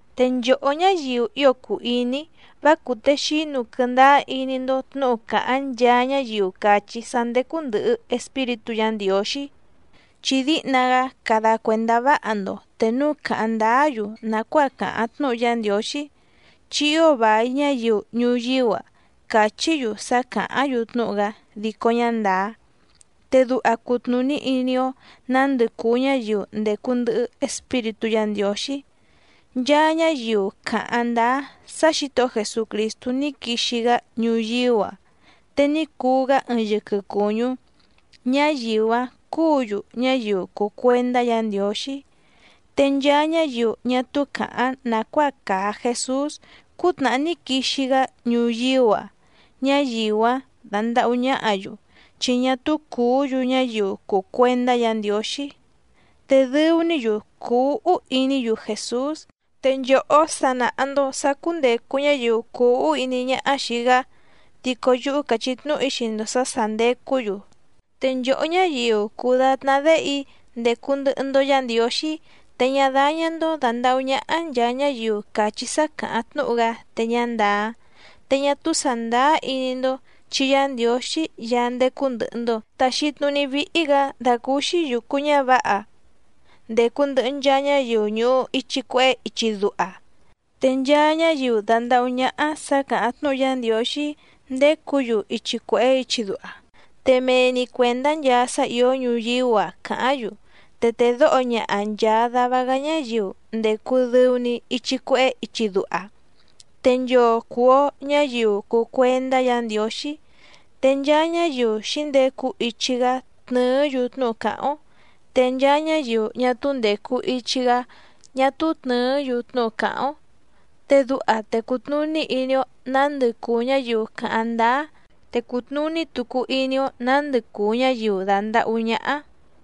Te nchòhó ñáyiu ío cùu iní‑í, vá cùtexínu quɨndáá iní‑ndó tnǔhu càháⁿ nchaa ñáyiu càchí sá ndécú ndɨ̀hɨ Espíritú Yǎ Ndiǒxí. Chi díhna‑gá cada cuèndá váha‑ndo te núu càháⁿ ndáá‑yu nàcuáa càháⁿ tnúhu Yá Ndiǒxí, chi ío vài ñáyiu ñuyíú‑a cachí‑yu sá càháⁿ‑yu tnúhu‑gá dico ñá ndàá. Te duha cutnùní iní‑ó nǎndɨ cùu ñáyiu ndècu ndɨhɨ Espíritú Yǎ Ndiǒxí. Nchaa ñáyiu càháⁿ ndáá sá Xǐtohó Jesucrìstú ní quixi‑gá ñuyíú‑a te ní cuu‑gá ɨɨⁿ yɨquɨ cùñú, ñáyiu‑áⁿ cúǔ‑yu ñáyiu cùu cuendá Yǎ Ndiǒxí. Te nchaa ñáyiu ñá túú càháⁿ nàcuáa càa Jesús cútnàhá ní quixi‑gá ñuyíú‑a ñáyiu‑áⁿ dándàhú ñáhǎ‑yu, chi ñá túú cùú‑yu ñáyiu cùu cuendá Yǎ Ndiǒxí. Te dɨu‑ní‑yu cùu úhú iní‑yu Jèsús. Te nchòhó sa nàha‑ndo sá cúndècu ñáyiu cuu úhú iní ñáhá xìi‑gá, dico yúhú càchí tnúhu‑í xii‑ndo sǎ sà ndecú‑yu. Te nchòhó ñáyiu cùu datná déhe‑í, ndècu ndɨhɨ‑ndo Yá Ndiǒxí, te ñá dáñá‑ndó dàndahú ñáhá nchàa ñáyiu càchí sá càháⁿ tnúhu‑gá te ñá ndàá. Te ñá túú sàndáá iní‑ndó chi Yá Ndiǒxí Yaá ndécú ndɨ̀hɨ‑ndo taxi tnuní víhí‑gǎ dàcúúxí yùcu ñávǎha ndècu ndɨhɨ nchaa ñáyiu ñùhu ichi cuehé ichi duha. Te nchaa ñáyiu dàndahú ñáhá sǎ càháⁿ tnúhu Yá Ndiǒxí ndécǔ‑yu ichi cuèhé ichi duha, te mee‑ni cuèndá nchaa sá ìó ñuyíú‑a càháⁿ‑yu. Te tèdóho ñaha nchàa dava‑gá ñáyiu ndècu dɨu‑ni ichi cuehé ichi duha. Te nchoo cùu‑o ñáyiu cùu cuendá Yǎ Ndiǒxí. Te nchaa ñáyiu xǐndecu ichi‑gá tnɨ̀ɨ́‑yu tnúhu càháⁿ‑ó, te nchaa ñáyiu ñá túú ndècu ichi‑gá ñá túú tnɨ̀ɨ́‑yu tnúhu càháⁿ‑ó. Te duha te cùtnuní iní‑ó nǎndɨ cùu ñáyiu càháⁿ ndáá, te cùtnuní tucu iní‑ó nǎndɨ cùu ñáyiu dàndahú ñáhá.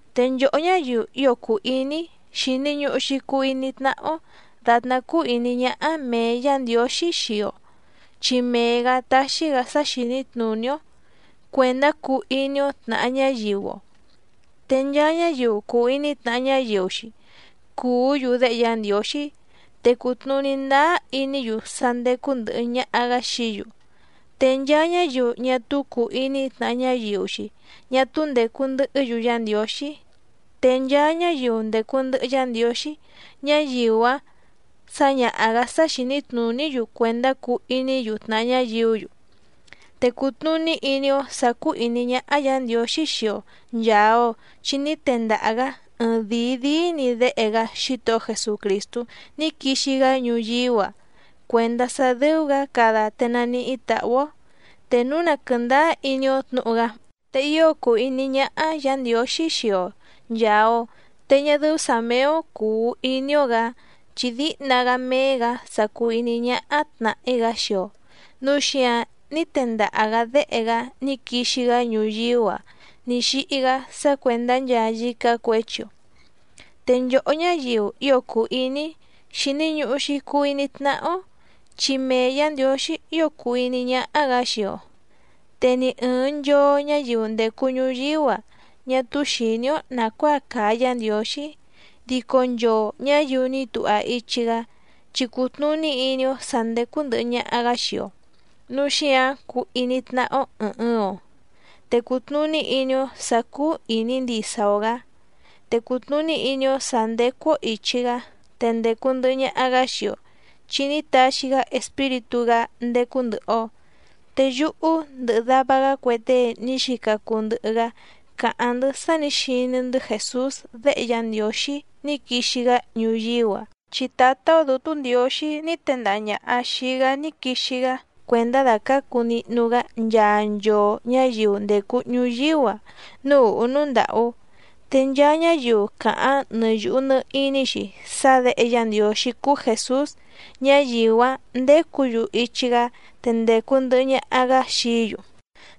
Te nchòhó ñáyiu ío cùu iní‑í, xìni ñuhu‑xi cuu iní tnáhá‑ó dàtná cúú ìní ñáhá mèe Yá Ndiǒxí xii‑o, chi mee‑gǎ táxí‑gǎ sá xìní tnùní‑ó cuèndá cuu iní‑ó tnàha ñáyiu‑o. Te nchaa ñáyiu cùu iní tnàha ñáyiu‑xi cùú‑yu déhe Yá Ndiǒxí, te cùtnuní ndáá iní‑yu sá ndécú ndɨ̀hɨ ñaha‑gá xií‑yu. Te nchaa ñáyiu ñá túú cùu iní tnàha ñáyiu‑xi ñá túú ndècu ndɨhɨ́‑yu Yá Ndiǒxí. Te nchaa ñáyiu ndècu ndɨhɨ Yá Ndiǒxí, ñáyiu‑áⁿ sǎñaha‑gǎ sá xìní tnùní‑yu cuèndá cuu iní‑yu tnàha ñáyiú‑yu. Te cùtnuní iní‑ó sǎ cúú ìní ñáhá Yǎ Ndiǒxí xii‑o nchàa‑o, chi ní tendaha‑gǎ ɨɨⁿdìi díí‑ni Déhe‑gá Xítohó Jesucrìstú ní quixi‑gá ñuyíú‑a cuèndá sá dɨ́ú‑gǎ cada te naníhí tàhú‑ó, te núu na quɨ̀ndáá iní‑ó tnǔhu‑gá. Te ío cùu iní ñáhá Yǎ Ndiǒxí xii‑o nchàa‑o. Te ñá dɨ́ú sǎ méé‑ó cùu iní‑ó‑gǎ, chi díhna‑gá méé‑gǎ sa cùu iní ñáhá tnàhí‑gá xii‑o, núu xíǎⁿ ní tendaha‑gǎ Déhe‑gá ní quixi‑gá ñuyíú‑a ní xíhí‑gá sá cuèndá nchaa yícá cuěchi‑o. Te nchòhó ñáyiu ío cùu iní‑í, xìni ñuhu‑xi cuu iní tnáhá‑ó, chi mee Yǎ Ndiǒxí ío cùu iní ñáhá‑gǎ xii‑o. Te ni ɨ̀ɨⁿ nchoo ñáyiu ndècu ñuyíú‑a ñá túú xìní‑ó nàcuáa càa Yá Ndiǒxí, dico nchoo ñǎyiu ní tuha ichi‑gá chi cùtnuní iní‑ó sǎ ndécú ndɨ̀hɨ ñaha‑gá xii‑o. Núu xíǎⁿ cúú ìní tnáhá‑ó ɨ̀ɨⁿ ɨɨⁿ‑o, te cùtnuní iní‑ó sǎ cúú ìní ndisa‑o‑gǎ. Te cùtnuní iní‑ó sǎ ndécú‑ó ìchi‑gá, te ndècu ndɨhɨ ñaha‑gá xii‑o, chi ní taxi‑gá Espíritú‑gá ndécú ndɨ̀hɨ‑o. Te yúhú ndɨhɨ dava‑gá cue tée ní xica cuu ndɨhɨ‑gá càháⁿ‑ndɨ́ sá nǐ xiní‑ndɨ́ Jèsús Déhe Yá Ndiǒxí ní quixi‑gá ñuyíú‑a, chi Tǎtá‑ó Dǔtú Ndiǒxí ní tendaha ñàha xii‑gá ní quixi‑gá cuèndá dàcácu nihnu‑gá nchaa nchoo ñǎyiu ndècu ñuyíú‑a núú ùhú núú ndàhú. Te nchaa ñáyiu càháⁿ nɨ yùhu nɨ iní‑xi sá Děhe Yá Ndiǒxí cúú Jèsús, ñáyiu‑áⁿ ndécǔ‑yu ichi‑gá te ndècu ndɨhɨ ñaha‑gá xií‑yu.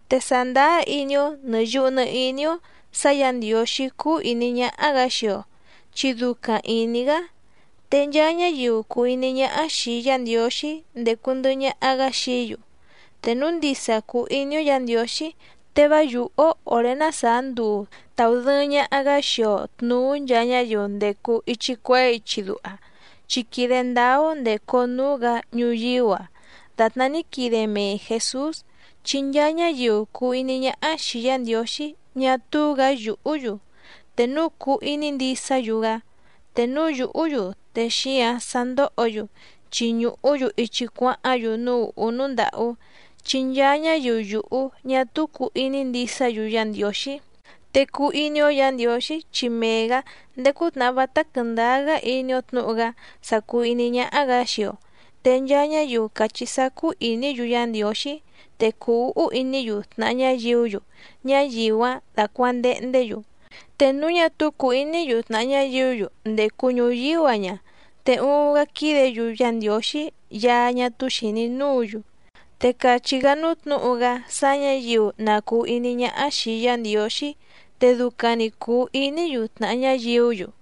Te sàndáá iní‑ó nɨ̀ yuhu nɨ iní‑ó sǎ Yǎ Ndiǒxí cúú ìní ñáhá‑gǎ xii‑o, chi ducaⁿ ìní‑gá. Te nchaa ñáyiu cùu iní ñáhá xìi Yá Ndiǒxí ndécú ndɨ̀hɨ ñaha‑gá xií‑yu. Te núu ndisa cùu iní‑ó Yǎ Ndiǒxí te vá yùhú‑ó òré ná sàá nduu tàudɨɨⁿ ñaha‑gá xii‑o tnùú nchaa ñáyiu ndècu ichi cuehé ichi duha, chi quìde ndáá‑ó ndècu‑o núú‑gǎ ñuyíú‑a dàtná ní quide mee Jèsús. Chi nchaa ñáyiu cùu iní ñáhá xìi Yá Ndiǒxí ñá túú‑gǎ yùhú‑yu, te núu cùu iní ndisá‑yu‑gá. Te núu yùhú‑yu te xíǎⁿ sa ndòhó‑yu, chi ñùhú‑yu ichi cuáháⁿ‑yu núú ùhú núú ndàhú, chi nchaa ñáyiu yùhú ñá túú cùu iní ndisá‑yu Yá Ndiǒxí. Te cuu iní‑ó Yǎ Ndiǒxí, chi mee‑gǎ ndéé cútnàhá vátá quɨ̀ndáá‑gá iní‑ó tnǔhu‑gá sa cùu iní ñáhá‑gǎ xii‑o. Te nchaa ñáyiu càchí sá cúú ìní‑yu Yá Ndiǒxí, te cùu úhú iní‑yu tnàha ñáyiú‑yu, ñáyiu‑áⁿ dácuàndehndé‑yu. Te núu ñá túú cùu iní‑yu tnàha ñáyiú‑yu ndècu ñuyíú‑a ña, te uuⁿ‑gá quídě‑yu Yá Ndiǒxí Yaá ñá túú xìní núǔ‑yu. Te càchí‑gá núú tnǔhu‑gá sá ñǎyiu na cùu iní ñáhá xìi Yá Ndiǒxí, te ducaⁿ‑ni cùu iní‑yu tnàha ñáyiú‑yu.